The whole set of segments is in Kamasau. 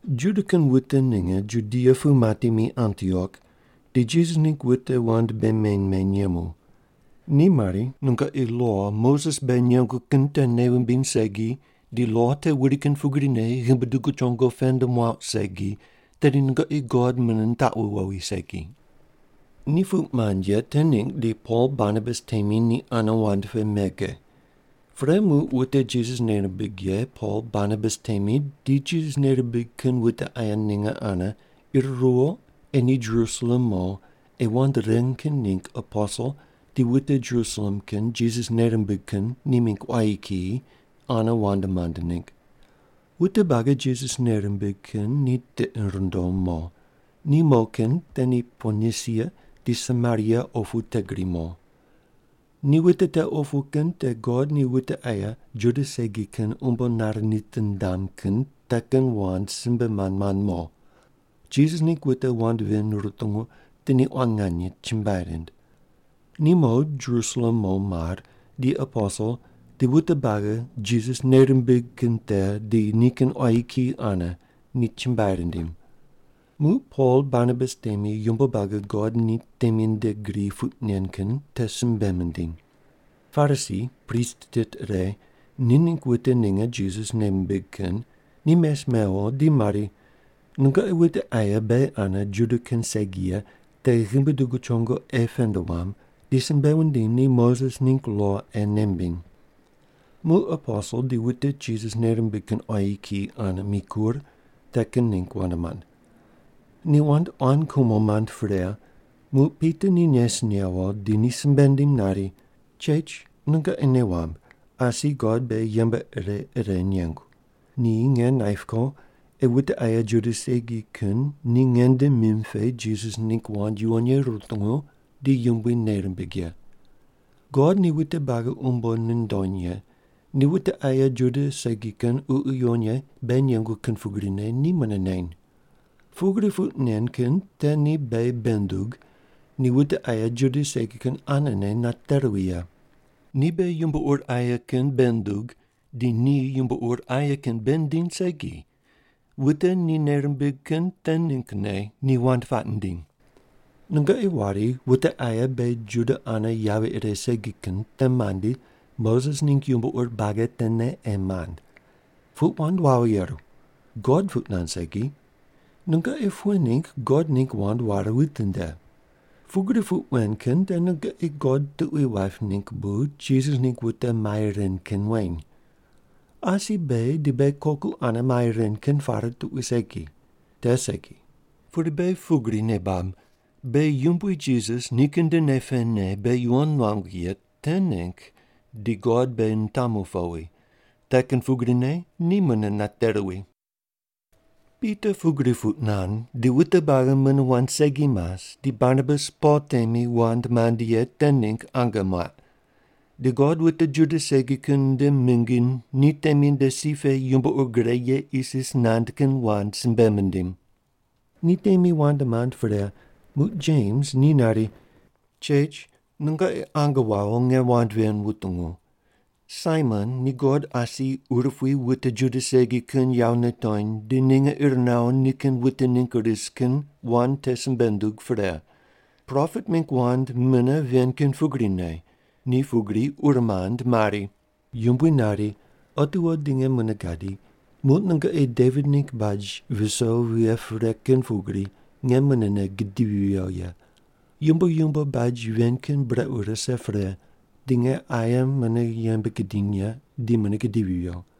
Juda kin wute ninge Judia pu mati mi Antiok, di Jisas ningg wute wand bei meny meny yemu. Ni mari, “Nungoqi lo Moses beghi nengu kin te nei wumbiny segi di lo te wuri kin pugrine ghimbi dugu chongo pend muauq segi, tedi nungoqi God mune nitaqu wowi segi.” Ni puq mand ye te ningg di Pol Barnabas temi ni ane wand pe mege. Pre muq wute Jisas nei rimbig ye Pol Barnabas temi di Jisas nei mimbig kin wute aye ninge ane ir ruwo ei ni Jerusalem mo ei wand ren kin ningg aposel di wute Jerusalem kin Jisas nei rimbig kin ni mingg quayi kiyi ane wand mand ningg. Wute buagi Jisas nei rimbig kin ni tiqi rindom mo. Ni mo kin te ni Ponisia di Samaria opu te gri mo. Ni wute te opu kin te God ni wute aye Juda segi kin umbo nare nitindam kin te kin wand simbe mand mand mo. Jisas ningg wute wand ven rutungu di ni quan nganye chumbuai rind. Ni mo Jerusalem mo mar di aposel di wute buagi Jisas nei rimbig kin te di nikin quayi kiyi ane ni chumbuai rindim. Muq Pol Barnabas temi yumbo buagi God ni temi nde gri puq nen kin te simbe mindiny. Parisi, prist tit ire, ni ningg wute ninge Jisas nei mimbig kin ni mes mewo di mari, “Nungoqi wute aye beghi ane Juda kin segi ye te ghimbi dugu chongo ei pend wuam, di simbe wundim ni Moses ningg lo ei nei mimbiny.” Muq aposel di wute Jisas nei rimbig kin quayi kiyi ane mikur, te kin ningg wand mand. Ni wand quan kumo mand pre, muq Pita ni nes newo di ni simbe nindim nari, “Chech, nungoqi nei wamb, asi God beghi yembe ire ire nengu. Ni nge naip ko ei wute aye Juda segi kin ni nge nde mim pe Jisas ningg wand yuwon ye rutungu di Yumbui nei rimbig ye. God ni wute buagi umbo nundony ye, ni wute aye Juda segi kin Ququ Yuwon Ye beghi nengu kin pugrine ni mune neny. Pugri puq nen kin te ni beghi bei nundug, ni wute aye Juda segi kin anene nate ruwi ye. Ni beghi yumbo ur aye kin bei nundug di ni yumbo ur aye kin bei nindiny segi. Wute ni nei rimbig kin te ninggne ni wand puaq nindiny. “Nungoqi wari wute aye beghi Juda ane yavi ire segi kin te mandi, Moses ningg yumbo ur buagi tene ei mand. Puq wand wawo yeru. God puq nand segi. Nungoqi pughe ningg God ningg wand ware witinde? Pugri puq wen kin te nungoqi God tuqui waip ningg bu Jisas ningg wute mai ren kin weny. Asi beghi di beghi koku ane mai ren kin pare tuqui segi. Te segi! Pudi beghi pugri nei bab: Beghi Yumbui Jisas nikin nde nei pene beghi yuwon nuangu ye te ningg di God beghi nitamu powi, te kin pugrine ni mune nate ruwi.” Pita pugri puq nand, di wute buagi mune wand segi mas di Barnabas Pol temi wand mand ye te ningg ange muaq. Di God wute Juda segi kin nde mingi ni temi nde si pe yumbo ur gre ye isis nand kin wand simbe mindim. Ni temi wand mand pre, muq Jems ni nari, “Chech, nungoqi ange wawo nge wand ven wutungu. Saimon ni God asi urupui wute Juda segi kin yawo nitony di ninge ir nawo nikin wute ningg ris kin wand te simbe nundug pre. Propet mingg wand mune ven kin pugrine. Ni pugri ur mand mari: “Yumbui nari, ‘Otiwo di nge mune gadi, muq nungoqi Devit ningg baj viso vighe pre kin pugri, nge munene gidivi viyo ye. Yumbo yumbo baj ven kin brequ rise pre, di nge aye mune yembe gidiny ye, di mune gidivi viyo.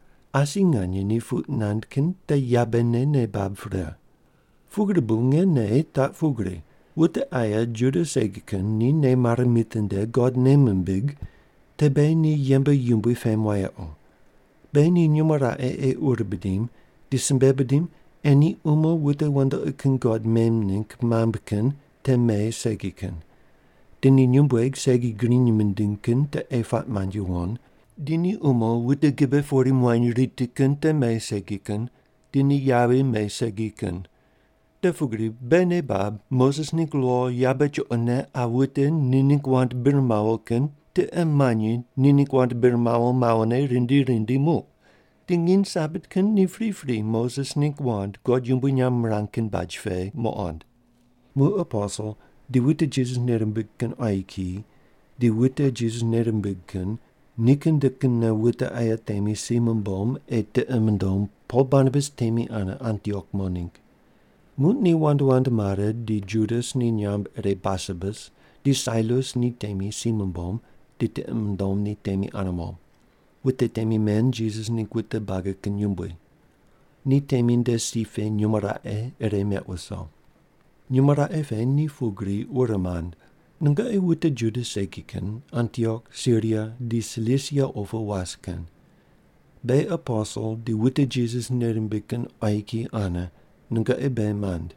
Asi nganye ni puq nand kin te yabene nei bab pre. “Pugri bu nge nei taq pugri: Wute aye Juda segi kin ni nei mare mitinde God nei mimbig, te beghi ni yembe yumbui pem wayequ. Beghi ni nyumo raqe ei ur bidim, di simbe bidim ei ni umo wute wandoqi kin god mem ningg mambui kin te me segi kin. Di ni nyumbueg segi griny mindiny kin te ei puaq mand yuwon. Di ni umo wute gibe pori muany riti kin te me segi kin. Di ni yavi me segi kin. Te pugri beghi nei bab Moses ningg lo yabe chuqone qa wute ni ningg wand bir mawo kin tiqe manyi ni ningg wand bir mawo mawone rindi rindi muq. Di nginy Sabat kin ni pripri Moses ningg wand God yumbui nyamb mirang kin baj pe muqond.” Muq aposel di wute Jisas nei rimbig kin quayi kiyi di wute Jisas nei rimbig kin nikin nde kinne wute aye temi si mumbom ei tiqi mundom Pol Barnabas temi ane Antiok mo ningg. Muq ni wand wand mare di Judas ni nyamb ire Barsabas, di Sailas ni temi si mumbom di tiqi mundom ni temi ane mo. Wute temi men Jisas ningg wute buagi kin yumbui. Ni temi nde si pe nyumo raqe ire meq wuso. Nyumo raqe pe ni pugri ur mand: “Nungoqi wute Juda segi kin Antiok, Siria, di Silisia opu was kin. Beghi aposel di wute Jisas nei rimbig kin quayi kiyi ane, nungoqi beghi mand.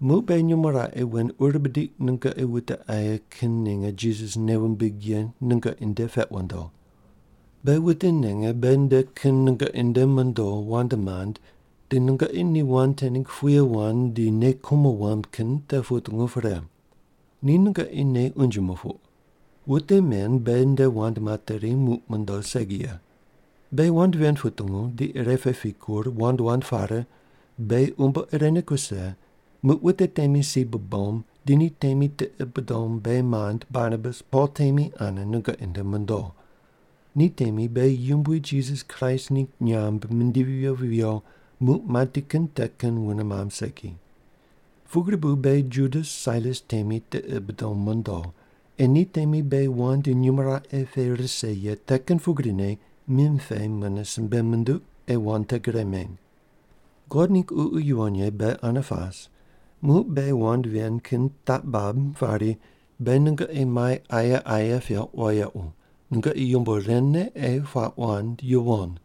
Muq beghi nyumo raqe wen ur bidiq, nungoqi wute aye kin ninge Jisas nei wumbig ye nungoqi nde peq wundo. Beghi wute ninge beghi nde kin nungoqi nde mondo wand mand di nungoqi ni wand te ningg puye wand di nei kumo wamb kin te putungu pre. Ni nungoqi nei unje mupuq. Wute men beghi nde wand materi muq mondo segi ye. Beghi wand ven putungu, di ire pe pikur, wand wand pare, beghi umbo irene kuse, muq wute temi si bubom, di ni temi tiqi bidom beghi mand Barnabas Pol temi ane nungoqi nde mondo. Ni temi beghi Yumbui Jisas Kraist ningg nyamb mindivi viyo viyo muq mati kin te kin wune mamb segi. Pugri bu beghi Judas Sailas temi tiqi bidom mondo, ei ni temi beghi wand nyumo raqe pe rise ye te kin pugrine mim pe mune simbe munduq ei wand te gre meny. God ningg Ququ Yuwon Ye beghi ane pas, muq beghi wand ven kin taq bab pari, beghi nungoqi mai aye aye peuq wayequ, nungoqi yumbo ren ne ei puaq wand yuwon: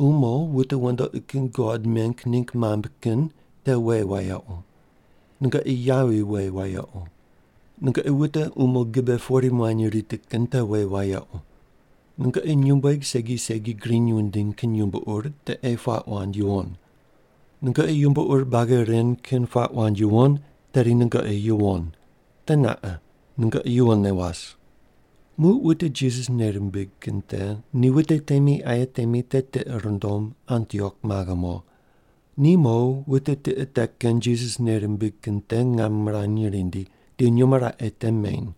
Umo wute wandoqi kin god meng ningg mambui kin te we wayequ. Nungoqi yavi we wayequ. Nungoqi wute umo gibe pori muany riti kin te we wayequ. Nungoqi nyumbueg segi segi griny wundiny kin yumbo ur te ei puaq wand yuwon. Nungoqi yumbo ur buagi ren kin puaq wand yuwon, tedi nungoqi yuwon. Teneqa. Nungoqi yuwonne was.” Muq wute Jisas nei rimbig kin te ni wute temi aye temi te tiqi rindom Antiok maghe mo. Ni mo wute tiqe te kin Jisas nei rimbig kin te ngam mirany rindi, di nyumo raqe te meny.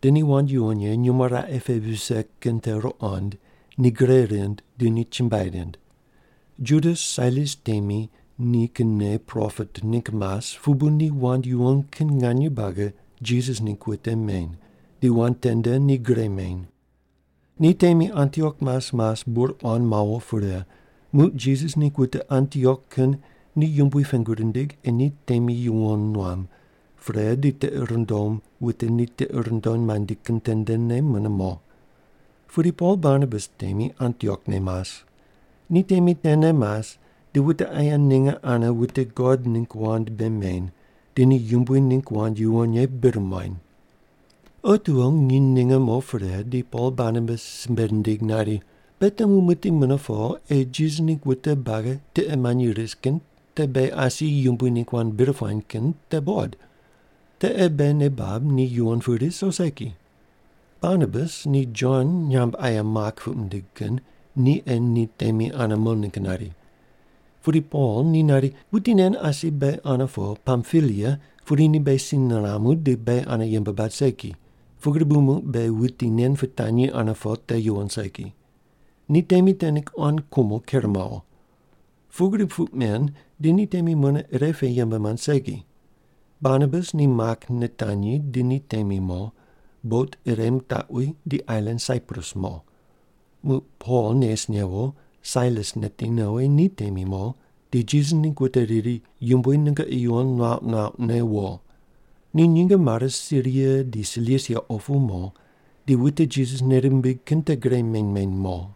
Di ni wand yuwon ye nyumo raqe pe vise kin te ruqond, ni gre rind di ni chumbuai rind. Judas Sailas temi ni kinne propet ningg mas pu bu ni wand yuwon kin nganye buagi Jisas ningg wute meny, di wand tende ni gre meny. Ni temi Antiok mas mas bur quan mawo pre, muq Jisas ningg wute Antiok kin ni Yumbui pengu rindig ei ni temi yuwon nuam, pre di tiqi rindom wute ni tiqi rindom mandi kin tendene mune mo. Pudi Pol Barnabas temi Antiok ne mas. Ni temi tene mas di wute aye ninge ane wute God ningg wand bei meny, di ni Yumbui ningg wand yuwon ye bir muany. Otiwo nginy ninge mo pre di Pol Barnabas simbe nindig nari, “Beghi temu muqdi mune po ei Jisas ningg wute buagi tiqe manyi ris kin te beghi asi Yumbui ningg wand bir puany kin te buqod. Te ei beghi nei bab ni yuwon pu ris o segi.” Barnabas ni Jon nyamb aye Mak puq mindig kin ni ei ni temi ane mo ningg nari. Pudi Pol ni nari, “Wuti nen asi beghi ane po Pampilia pudi ni beghi si niramu di beghi ane yembe bad segi. Pugri bu muq beghi wuti nen pitanyi ane po te yuwon segi.” Ni temi te ningg quan kumo ker mawo. Pugri puq men, di ni temi mune ire pe yembe mand segi. Barnabas ni Mak nitanyi di ni temi mo, bot ire mitaqwi di ailan Saiprus mo. Muq Pol nes newo, Sailas neti nowi ni temi mo, di Jisas ningg wute riri, “Yumbui nungoqi yuwon nuauq nuauqne wo.” Ni nyinge mare Siria di Silisia opu mo, di wute Jisas nei rimbig kin te gre meny meny mo.